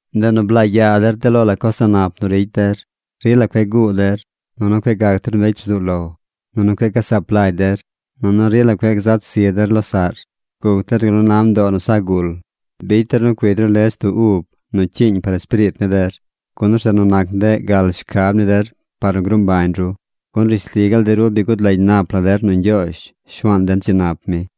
Ndeꞌ nu blaa yaa der de lo la coz a̱ꞌ nap nu ricy der. Rila cueꞌ guu der. Nunu cueꞌ gac der mbecy rzuu lo. Nunu cueꞌ gasaap lagy der. Nunu rila cueꞌ gzat zi der losaꞌr. Guc der gal nu na mdoo nu sa gul. Bicy der nu cuigy ru lech du ub nu cyiiñ par espiriit ni der, gun orzeꞌ nu nac ndeꞌ gal shcab ni der par nu gruu mbañ ru. Gun rishli gaal de ru bi gud lagy nap la der nu Ñgyoozh Shuaan den dzi nap mi.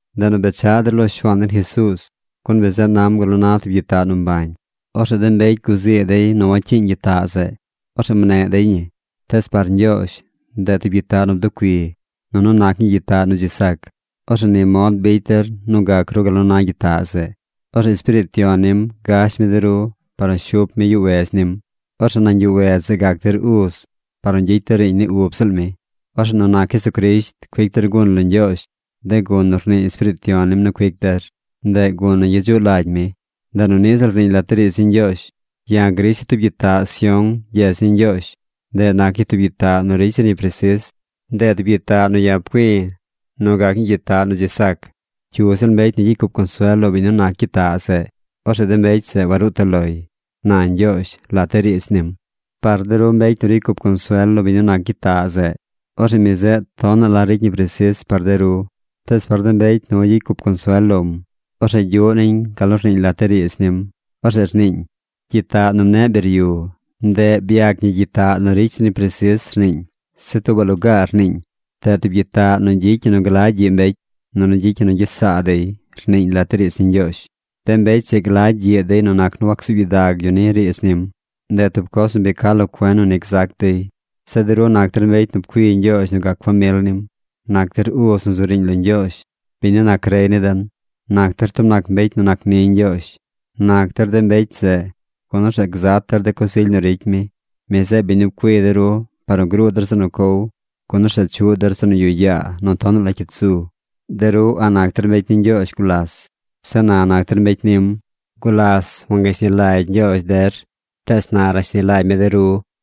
Ndeꞌ nu bechaꞌ der lo Shuaan den Jesuuz, gun mi zeꞌ nam gal nu na tub gyitaꞌ nu mbañ. Orzeꞌ de mbecy guzii dey nu wacyiiñ gyitaꞌ zeꞌ. Orzeꞌ mneꞌ dey ñii. Tees par Ñgyoozh, ndeꞌ tub gyitaꞌ nu bducui. Nunu nac ñii gyitaꞌ nu dzi sac. Orzeꞌ ni mod bicy der nu gac ru gal nu na gyitaꞌ zeꞌ. Orzeꞌ Espiriit Yon nim gash mi de ru par nu shup mi yuꞌ wedz nim. Orzeꞌ nañ yuꞌ wedz zeꞌ gac der uz par nu gyicy der riiñ ni ub ziꞌl mi. Orzeꞌ nu nac Jesucrisht cuic der gun lo Ñgyoozh, de gun nu rnii Espiriit Yon nim nu cuic der. Ndeꞌ gun nu gyedzuꞌ lagy mi. Ndeꞌ nu niꞌ ziꞌl rniiñ lat de riidz ni Ñgyoozh: Ya̱ grisha̱ tub gyitaꞌ Sión gyedz ni Ñgyoozh. Ndeꞌ nac ñii tub gyitaꞌ nu ricy zir ñi presis. Ndeꞌ tub gyitaꞌ nu ya̱ pcui̱ nu gac ñii gyitaꞌ nu dzi sac. Cyu ziꞌl mbecy nu gyicy cup consuel lo biñ nu nac gyitaꞌ zeꞌ, orzeꞌ de mbecy zeꞌ waruu toꞌ loy, na Ñgyoozh lat de riidz nim. Par de ru mbecy nu ricy cup consuel lo biñ nu nac gyitaꞌ zeꞌ, orzeꞌ mi zeꞌ tonaꞌ la ricy ñi presis par de ru, tees par de mbecy nu wagyicy cup consuel lom, orzeꞌ gyuꞌ niñ gal nu rniiñ lat de riidz nim. Orzeꞌ rniiñ: Gyitaꞌ nu mneꞌ biryu, ndeꞌ byac ñi gyitaꞌ nu ricy zir ñi presis, rniiñ. Zeꞌ tuubaꞌ lugaar rniiñ: Ndeꞌ tub gyitaꞌ nu gyicy ñi nu glagy gyiꞌ mbecy. Nunu gyicy ñi nu gyes saa dey, rniiñ lat de riidz ni Ñgyoozh. De mbecy zeꞌ glagy gyiꞌ dey nu nac nu wacsuub gyidag yu ni riidz nim. Ndeꞌ tub coz nu bi ca lo cuen nu ni gzac dey. Zeꞌ de ru nac der mbecy nu pcui Ñgyoozh nu gac famil nim. Nac der uz nu zu riiñ lo Ñgyoozh, biñ nu nac rey ni den. Nac der tub nac mbecy nu nac ni Ñgyoozh. Nac der de mbecy zeꞌ, gun orzeꞌ gzat der de coz ily nu ricy mi. Mi zeꞌ biñ nu pcui de ru par nu gruu der zeꞌ nu cow, gun orzeꞌ chuꞌ der zeꞌ nu yuꞌ yaa nu tonaꞌ la cyit zu. De ru a̱ꞌ nac der mbecy ni Ñgyoozh gulas. Zeꞌ na nac der mbecy nim. Gulas wangashni lagy Ñgyoozh de ru. Tees na rashni lagy mi der.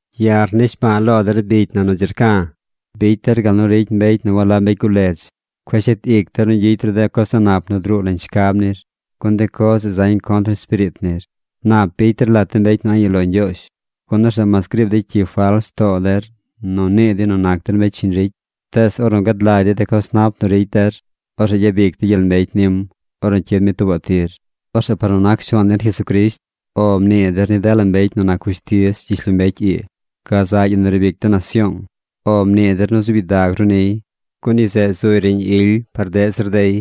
Ya̱ rnishbaa lo der bicy na nu dzi rca̱, bicy der gal nu ricy mbecy nu walab mbecy guledz. Cueꞌ shet ic der nu gyicy ru de coz a̱ꞌ nap nu druu nañ shcab nir, gun de coz zeꞌ zañ contr ni espiriit nir. Nap bicy der lat de mbecy nu a̱ꞌ yuꞌ lo Ñgyoozh, gun orzeꞌ mas griib dey cyi fals too der nu nii dey nu nac der mbecy shiñ ricy, tees ornu gad lagy dey de coz nap nu ricy der. Orzeꞌ gyabic dey gyel mbecy nim ornu cyid mi tuubaꞌ tir. Orzeꞌ par nu nac Shuaan den Jesucrisht “O” mnii der ni dela mbecy nu nac fushtiz gyishlombecy ii. Gazaꞌ yu nu riib ic de nasyoong, “O” mnii der nu zuub gyidag ru niy, gun yu zeꞌ zuy riiñ ily par deꞌ zir dey.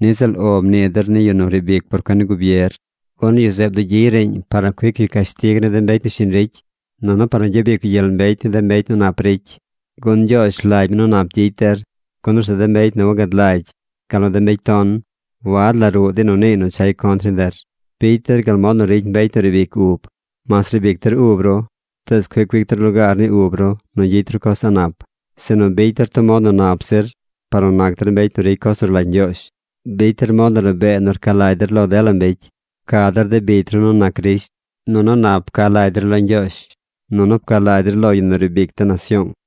Niꞌ ziꞌl “O” mnii der ni yu nu riib ic por cuen ni gubier, gun yu zeꞌ bdugyiy riiñ par nu cuic yu cashtig ni de mbecy nu shiñ ricy, nunu par nu gyabic yu gyel mbecy ni de mbecy nu nap ricy. Gun Ñgyoozh rlagy mi nu nap gyicy der, gun orzeꞌ de mbecy nu wagad lagy, gal nu de mbecy ton, wad la ruꞌ dey nu niiy nu chay contr ni der. Bicy der gal mod nu ricy mbecy nu riib ic ub. Mas riib ic der ub ru, tees cueꞌ cuic der lugaar ni ub ru nu gyicy ru coz a̱ꞌ nap. Sinu bicy der tub mod nu nap zir par nu nac der mbecy nu ricy coz nu rlagy Ñgyoozh. Bicy der mod nu rabee nu rca lagy der lo dela mbecy. Pca der de bicy ru nu nac Crisht. Nunu nap pca lagy der lo Ñgyoozh. Nunu pca lagy der lo yu nu riib ic de nasyoong.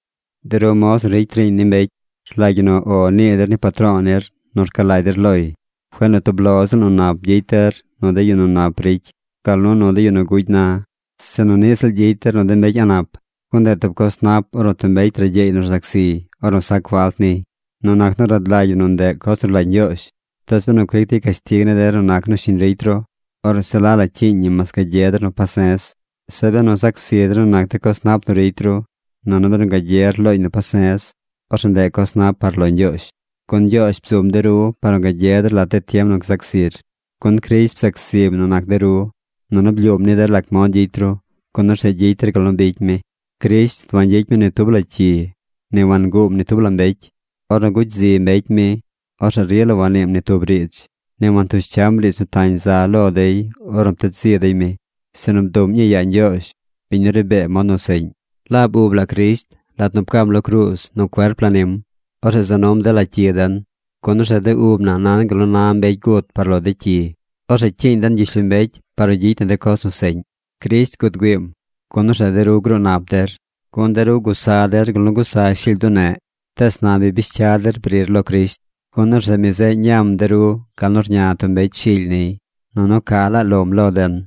De ru moz nu ricy riiñ ni mbecy, rlagy ñi nu “O” nii der ni patro̱o̱ nir nu rca lagy der loy. Cueꞌ nu tub lo ziꞌl nu nap gyicy der nu de yu nu nap ricy, gal nu nu de yu nu gugy na, sinu niꞌ ziꞌl gyicy der nu de mbecy a̱ꞌ nap. Gun ndeꞌ tub coz nap ornu tub mbecy ragyeey nu rzac ziy ornu sac falt niy nu nac nu rad lagy yu nu ndeꞌ coz nu rlagy Ñgyoozh. Tees benu cuic dey cashtig ni der nu nac nu shiñ ricy ru, orzeꞌ se la la cyiiñ ñi mas gagye der nu pase̱z. Zeꞌ benu zac zi der nu nac de coz nap nu ricy ru, nunu benu gagyer looñ nu pase̱z, orzeꞌ ndeꞌ coz nap par lo Ñgyoozh. Gun Ñgyoozh bzum de ru par nu gagye der lat de tiem nu gzac zir, gun Crisht bzac zim nu nac de ru. Nunu blyuum ni der lac mod gyicy ru, gun orzeꞌ gyicy der gal nu bicy mi. Crisht wangyicy mi ni tub la cyi. Ni wanguum ni tub la mbecy. Ornu gugy zi mbecy mi, orzeꞌ rila wanniim ni tub riidz. Ni wantush cyam riidz nu tañ za lo dey ornu pted zi dey mi, sinu bduꞌm ñii yaa Ñgyoozh, biñ nu ri bee mod nu seꞌñ. Laab ub la Crisht, lat nu pcam lo cruuz nu cuerp la nim, orzeꞌ za num dela cyi den, gun orzeꞌ de ub na nan gal nu na mbecy gut par lo de cyi. Orzeꞌ cyiiñ den gyishlombecy par nu gyicy na de coz nu seꞌñ. Crisht gud güiim, gun orzeꞌ de ru gruu nap der. Gun de ru gusa der gal nu gusa shily bduneꞌ. Tees na bi bish cya der brir lo Crisht, gun orzeꞌ mi zeꞌ ñam de ru gal nu rña tub mbecy shily niy, nunu ca laa lom lo den.